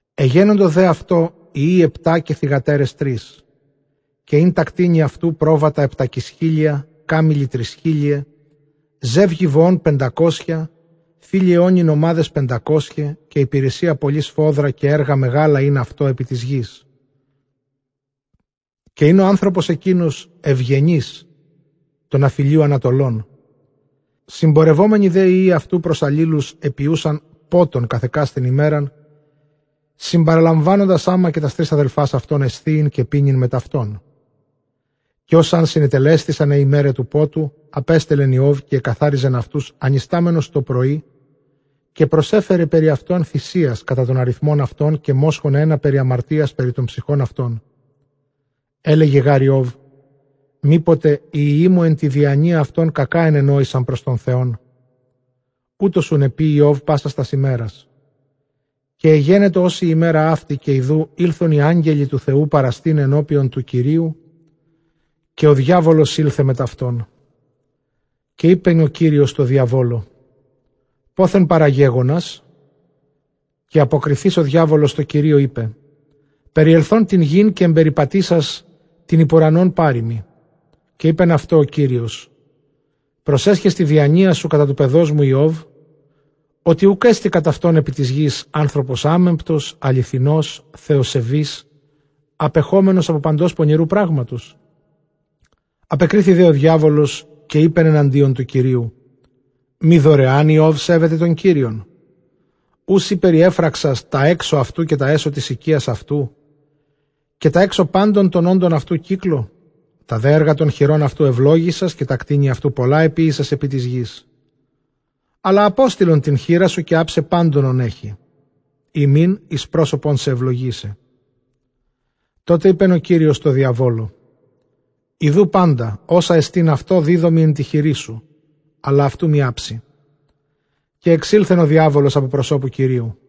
Ἐγένοντο δὲ αὐτῷ υἱοὶ ἑπτὰ καὶ θυγατέρες τρεῖς. Καὶ ἦν τὰ κτήνη αὐτοῦ πρόβατα ἑπτακισχίλια, κάμηλοι τρισχίλιαι, ζεύγη βοῶν πεντακόσια, θήλειαι ὄνοι νομάδες πεντακόσιαι, καὶ ὑπηρεσία πολλὴ σφόδρα, καὶ ἔργα μεγάλα ἦν αὐτῷ ἐπὶ τῆς γῆς, καὶ ἦν ὁ ἄνθρωπος ἐκεῖνος εὐγενὴς τῶν ἀφʼ ἡλίου ἀνατολῶν. Συμπορευόμενοι δὲ οἱ υἱοὶ αὐτοῦ πρὸς ἀλλήλους, ἐποιοῦσαν πότον καθʼ ἑκάστην ἡμέραν, συμπαραλαμβάνοντες ἅμα καὶ τὰς τρεῖς ἀδελφὰς αὐτῶν, ἐσθίειν καὶ πίνειν μετʼ αὐτῶν. Καὶ ὡς ἂν συνετελέσθησαν αἱ ἡμέραι τοῦ πότου, ἀπέστελλεν Ἰὼβ καὶ ἐκαθάριζεν αὐτοὺς ἀνιστάμενος τοπρωῒ, καὶ προσέφερε περὶ αὐτῶν θυσίας, κατὰ τὸν ἀριθμὸν αὐτῶν, καὶ μόσχον ἕνα περὶ ἁμαρτίας περὶ τῶν ψυχῶν αὐτῶν· ἔλεγε γὰρ Ἰὼβ, μή ποτε οἱ υἱοί μου ἐν τῇ διανοίᾳ αὐτῶν κακὰ ἐνενόησαν πρὸς Θεόν· οὕτως οὖν ἐποίει Ἰὼβ πάσας τὰς ἡμέρας. Καὶ ἐγένετο ὡς ἡ ἡμέρα αὕτη, καὶ ἰδοὺ ἦλθον οἱ ἄγγελοι τοῦ Θεοῦ παραστῆναι ἐνώπιον τοῦ Κυρίου, καὶ ὁ διάβολος ἦλθε μετʼ αὐτῶν. Καὶ εἶπεν ὁ Κύριος τῷ διαβόλῳ, πόθεν παραγέγονας; καὶ ἀποκριθεὶς ὁ διάβολος τῷ Κυρίῳ, εἶπε, περιελθὼν τὴν γῆν καὶ ἐμπεριπατήσας τὴν ὑπʼ οὐρανὸν πάρειμι. Καὶ εἶπεν αὐτῷ ὁ Κύριος, προσέσχες τῇ διανοίᾳ σου κατὰ τοῦ παιδός μου Ἰώβ; ὅτι οὐκ ἔστι κατʼ αὐτὸν ἐπὶ τῆς γῆς; ἄνθρωπος ἄμεμπτος, ἀληθινὸς, θεοσεβὴς, ἀπεχόμενος ἀπὸ παντὸς πονηροῦ πράγματος; Ἀπεκρίθη δὲ ὁ διάβολος, καὶ εἶπεν ἐναντίον τοῦ Κυρίου, μὴ δωρεὰν Ἰὼβ σέβεται τὸν Κύριον; Οὐ σὺ περιέφραξας τὰ ἔξω αὐτοῦ, καὶ τὰ ἔσω τῆς οἰκίας αὐτοῦ, καὶ τὰ ἔξω πάντων τῶν ὄντων αὐτοῦ κύκλῳ; τὰ δὲ ἔργα τῶν χειρῶν αὐτοῦ εὐλόγησας; καὶ τὰ κτήνη αὐτοῦ πολλὰ ἐποίησας ἐπὶ τῆς γῆς; Ἀλλὰ ἀπόστειλον τὴν χεῖρά σου, καὶ ἅψαι πάντων ὧν ἔχει· ἦ μὴν εἰς πρόσωπόν σε εὐλογήσει. Τότε εἶπεν ὁ Κύριος τῷ διαβόλῳ, ἰδοὺ πάντα ὅσα ἐστὶν αὐτῷ, δίδωμι ἐν τῇ χειρί σου, ἀλλʼ αὐτοῦ μὴ ἅψῃ· καὶ ἐξῆλθεν ὁ διάβολος παρὰ τοῦ Κυρίου.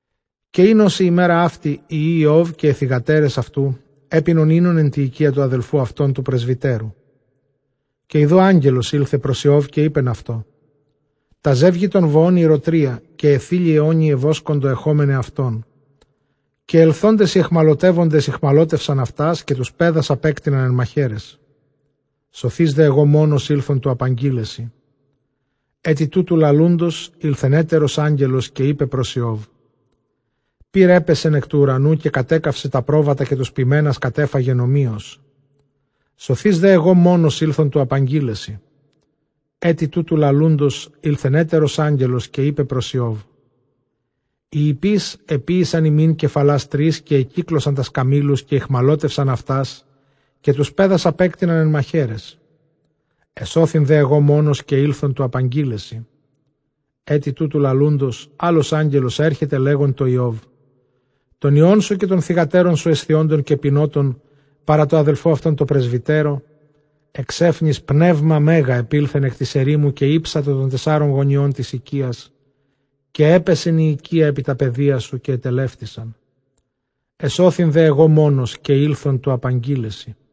Καὶ ἦν ὡς ἡ ἡμέρα αὕτη, οἱ υἱοὶ Ἰὼβ καὶ αἱ θυγατέρες αὐτοῦ ἔπινον οἶνον ἐν τῇ οἰκίᾳ τοῦ ἀδελφοῦ αὐτῶν τοῦ πρεσβυτέρου. Καὶ ἰδοὺ ἄγγελος ἦλθε πρὸς Ἰὼβ, καὶ εἶπεν αὐτῷ, τὰ ζεύγη τῶν βοῶν ἠροτρία, καὶ αἱ θήλειαι ὄνοι ἐβόσκοντο ἐχόμεναι αὐτῶν, καὶ ἐλθόντες οἱ αἰχμαλωτεύοντες ᾐχμαλώτευσαν αὐτὰς, καὶ τοὺς παῖδας ἀπέκτειναν ἐν μαχαίραις· σωθεὶς δὲ ἐγὼ μόνος ἦλθον τοῦ ἀπαγγεῖλαί σοι. Ἔτι τούτου λαλοῦντος, ἦλθεν ἕτερος ἄγγελος, καὶ εἶπε πρὸς Ἰὼβ, πῦρ ἔπεσεν ἐκ τοῦ οὐρανοῦ, καὶ κατέκαυσε τὰ πρόβατα, καὶ τοὺς ποιμένας κατέφαγεν ὁμοίως· σωθεὶς δέ ἐγὼ μόνος ἦλθον τοῦ ἀπαγγεῖλαί σοι. Ἔτι τούτου λαλοῦντος, ἦλθεν ἕτερος ἄγγελος, καὶ εἶπεν πρὸς Ἰὼβ, οἱ ἱππεῖς ἐποίησαν ἡμῖν κεφαλᾶς τρεῖς, καὶ ἐκύκλωσαν τὰς καμήλους, καὶ ᾐχμαλώτευσαν αὐτὰς, καὶ τοὺς παῖδας ἀπέκτειναν ἐν μαχαίραις· ἐσώθην δὲ ἐγὼ μόνος, καὶ ἦλθον τοῦ ἀπαγγεῖλαί σοι. Ἔτι τούτου λαλοῦντος, ἄλλος ἄγγελος ἔρχεται λέγων τῷ Ἰὼβ, τῶν υἱῶν σου καὶ τῶν θυγατέρων σου ἐσθίοντων καὶ πινόντων παρὰ τῷ ἀδελφῷ αὐτῶν τῷ πρεσβυτέρῳ, ἐξαίφνης πνεῦμα μέγα ἐπῆλθεν ἐκ τῆς ἐρήμου, καὶ ἥψατο τῶν τεσσάρων γωνιῶν τῆς οἰκίας, καὶ ἔπεσεν ἡ οἰκία ἐπὶ τὰ παιδία σου, καὶ ἐτελεύτησαν· ἐσώθην δὲ ἐγὼ μόνος, καὶ ἦλθον τοῦ ἀπαγγεῖλαί σοι.